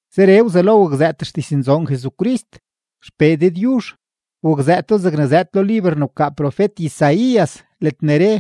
Zeree wzelo wakzëët xdiznzoon Jesucrist XPee Dëdyuzh. Wakzëëto zegne zëëd lo liber ne wkaa profet-Isaías ledne re: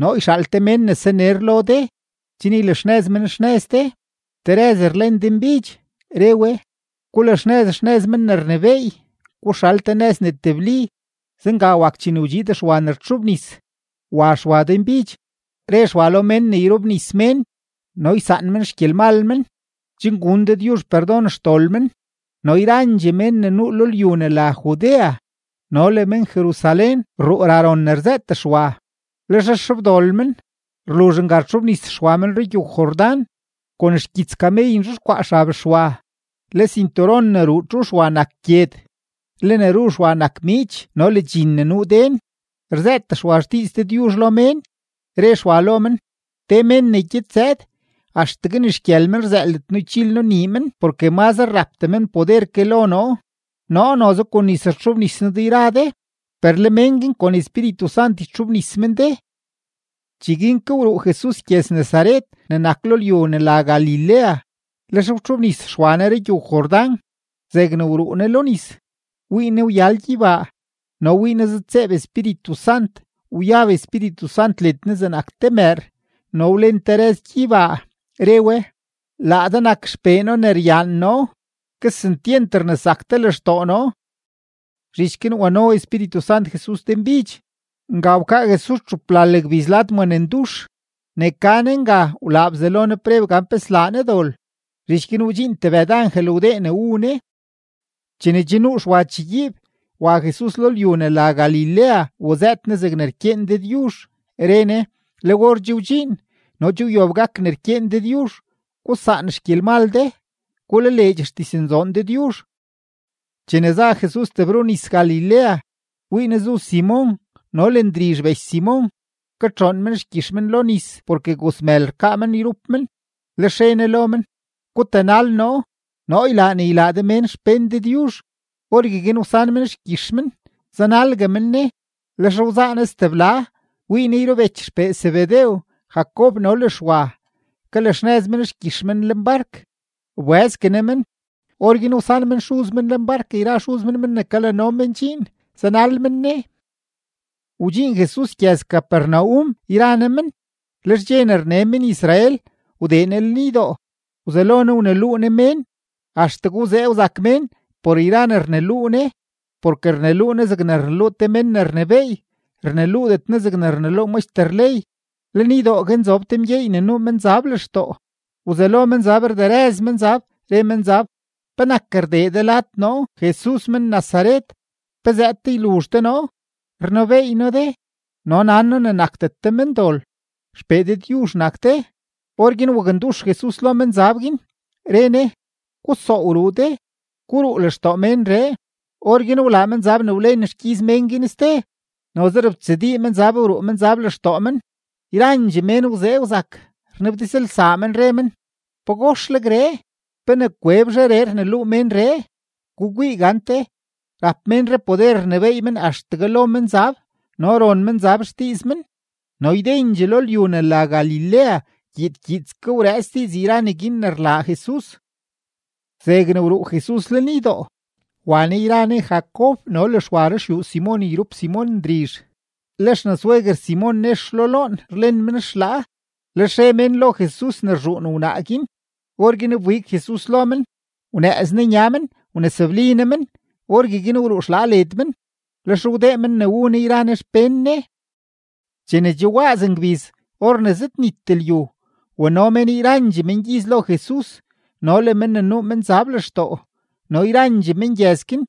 Noo yxaal te mén ne saner lo de chen ylaxnëz men xnëz de. Te rëz rlen denbidx, re we: “Gulaxnëz xnëz Men ne rnebééy, guxal te nëz ne tebli.” Zenga wak chene wdxiid Xwa ne rtxobnis, wa Xwa denbidx, re Xwa lo mén ne yrobnis men no ysaan men xgyelmal men chen gun Dëdyuzh perdon xdol men. No yrandxee mén ne nuu lo lyu ne la Judea no le men-Jerusalén rruu ra ron ne rzëët Xwa. Lex rxobdol men, rluzh nga rtxobnis Xwa men rugyow-Jordán. Kon xgyits kamey nzhexkwaa xab Xwa, le sinturon ne ruu txu Xwa nak gyed, le ne ru Xwa nak miich no le dxin ne nuu den. Rzëët Xwa xdiiz Dëdyuzh lo mén, re Xwa lo men: ―Te men ne gyed zëëd, axtegue ni xgyël men rzëëldet noo ychil noo nii men porke mazre rapdee men poder ke lo noo. Noo noze kon nis wtxobnis noo de yra de, per le mén guin kon Espíritu Sant ytxobnis men de. Cheguin ke wruu Jesus gyëz-Nazaret ne nak lo lyu ne la Galilea, lex wtxobnis Xwa Ne rugyow-Jordán. Zegne wruu Ne lo nis, wii Ne wyal gyeybaa no wii Ne zëdtseeb Espíritu Sant, wyab Espíritu Sant led Ne zegnak te mëër, no wlen te rëz gyeybaa, re we: ―Laa de nak XPee noo ne ryaan noo; kesentyent rnesak de lextoo noo. Zhich guin wano Espíritu Sant Jesus denbidx. Nga wkaa Jesus txuplal gbiz lad maa ne ndux; ne ka Ne nga wlaa Bzelo Ne preb gan pe slaa Ne dol. Zhich guin wdxiin tebëd angel wdee ne wu Ne. Chene che nuu Xwa chegyiib, wa Jesus lo lyu ne la Galilea wazëët Ne zegne rkyeen Dëdyuzh, re Ne: ―Le or che wdxiin no che wyob gak ne rkyeen Dëdyuzh. Gusaan xgyelmal de; gulaleedx xdiznzoon Dëdyuzh. Chene za Jesus tebrunis-Galilea, wii Ne zu Simon no le Ndrizh bech Simon, katxoon men xgyix men lo nis porke gozmël rkaa men yrup men. Lex re Ne lo men: ―Gutanal noo; noo ylaa ne ylaa de mén xpén Dëdyuzh. Orgueguin wsan men xgyix men, zanalgue men Ne. Lex wzaa Ne stebla, wii Ne yrubech xpee Zebedew, Jacob no le Xwa, kalaxnëz men xgyix men lenbark. Wbëzgue Ne men, orguin wsan men xuz men lenbark yra xuz men men ne kalano men dxiin, zanal men Ne. Wdxiin Jesus gyëz-Capernaum yra Ne men; lex dxe ne rne men-Israel, wdee Ne lenydoo, wzelo Ne wneluu Ne mén. Axtegue wzee wzak mén por yra ne rneluu Ne, porke rneluu Ne zegnak te men ne rnebééy, rneluudet Ne zegne rneluu maxter ley. Lenydoo guin zob te mgyeey ne nuu menzab lextoo. Wzelo menzab rderëz menzab, re menzab: ―¿Penak rdee de lad noo Jesus men-Nazaret? ¿Pe zëëd de yluzh de noo? Rnebeey noo de no nan noo ne nakdet de mendol, XPee Dëdyuzh nak de. Orguin wakndux Jesus lo menzab guin, re Ne: ―¡Gusoow ruu de! ¡Guruu lextoo ménree! Orguin wlaa menzab ne wlen xgyiz mén guin ste, noze robtsadii menzab wruu menzab lextoo men. Yrandxee mén wzee wzak, rnabdizlsaa men, re men: ―¡Pagoxlegree! ¿Pe ne kwebzheree rneluu ménree? ¡Gukwii gante, rap ménree poder rnebééy men axtegue lo menzab, no ron menzab xdiiz men! No ydendxee lo lyu ne la Galilea gyiid gyiidske wrëëts diiz yra neguin ne rlaa Jesus. Zegne wruu Jesus lenydoo, wa Ne yra Ne Jacob no le Xwa ruxyuu Simon yrup Simon Ndrizh. Le xnasweguer Simon nex lo loon rlen men xlaa, lex re mén lo Jesus ne rzhuun wnaa guin. Orguin wbig Jesus lo men, wnëëz Ne nya men wnesobli Ne men; orgueguin wruu xlaa led men. Lex wdee men ne wu Ne yra Ne xpén Ne. Chene che waaz ngbiz or ne che zëdnit lyu, wano mén yrandxee mengyiz lo Jesus no le mén ne nuu menzab lextoo. No yrandxee mengyëz guin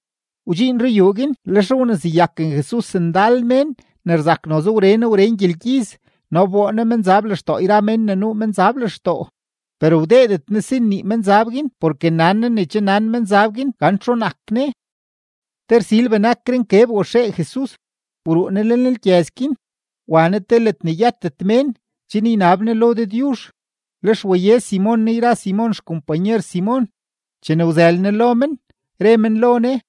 wdxiin ruyuu guin. Lex wneseyaken Jesus ndal mén ne rzak noze wren wren gyelgyiz, no wboo Ne menzab lextoo yra mén ne nuu menzab lextoo; per wdeedet Ne si nnii menzab guin porke nan Ne ne che nan menzab guin gan txu nak Ne. Te rsil benakre nkeb waxee Jesus, wruu Ne lenlgyëz guin wa Ne te ledne yëtet mén chen ynab Ne lo Dëdyuzh. Lex waye Simon Ne yra Simon xkompanyer Simon. Chene wzël Ne lo men, re men lo Ne: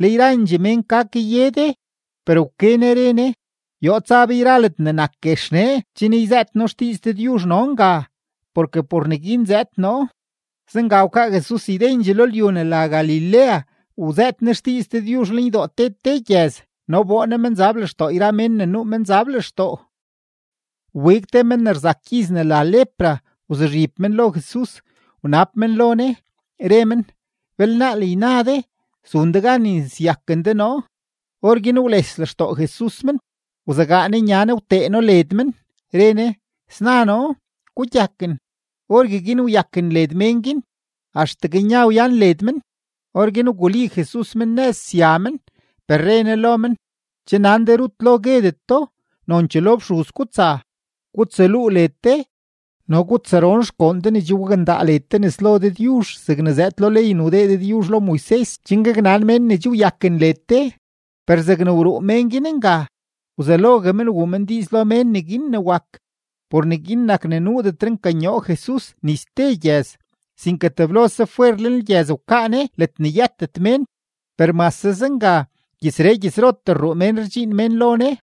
―Le yrandxee mén ka kaye de. Per wke Ne re Ne: ―Yoo tsa be yra ledne nak guex nee chen yzëët noo xdiiz Dëdyuzh no nga, porke por neguin zëëd noo. Zenga wkaa Jesus ydendxee lo lyu ne la Galilea wzëët Ne xdiiz Dëdyuzh lenydoo te te gyëz, no wboo Ne menzab lextoo yra mén ne nuu menzab lextoo. Wbig te men ne rzak gyiz ne la lepra, wzuzhib men lo Jesus, wnab men lo Ne, re men: ―Belnaal yna de zun de gan yneseyaken de noo. Orguin wles lextoo Jesus men, wzegaa Ne nya Ne wtee No led men, re Ne: ―Sna noo. Gugyaken. Orgueguin wyaken led mén guin, axtegue nya wyan led men. Orguin wguli Jesus men nëz sya men, per re Ne lo men: ―Che nan de rut lo guedet do, nonchee lo fxuz gutsa gutsaluu led de no gutsaron xgoon de ne che wakndaa de nes lo Dëdyuzh zegne zëëd lo ley ne wdee Dëdyuzh lo Moises chen gaknan mén ne che wyaken led de. Per zegne wruu mén guin nga, wzelogue men wuu men diiz lo mén neguin ne wak. Por neguin nak ne nuudetre nkanyoo Jesus ni ste gyëz, sinke teblose fwer lenlgyëz wkaa Ne ledne yëtet mén. Per mase zenga, gyëzree gyëzrotee rruu mén rdxiin mén lo Ne.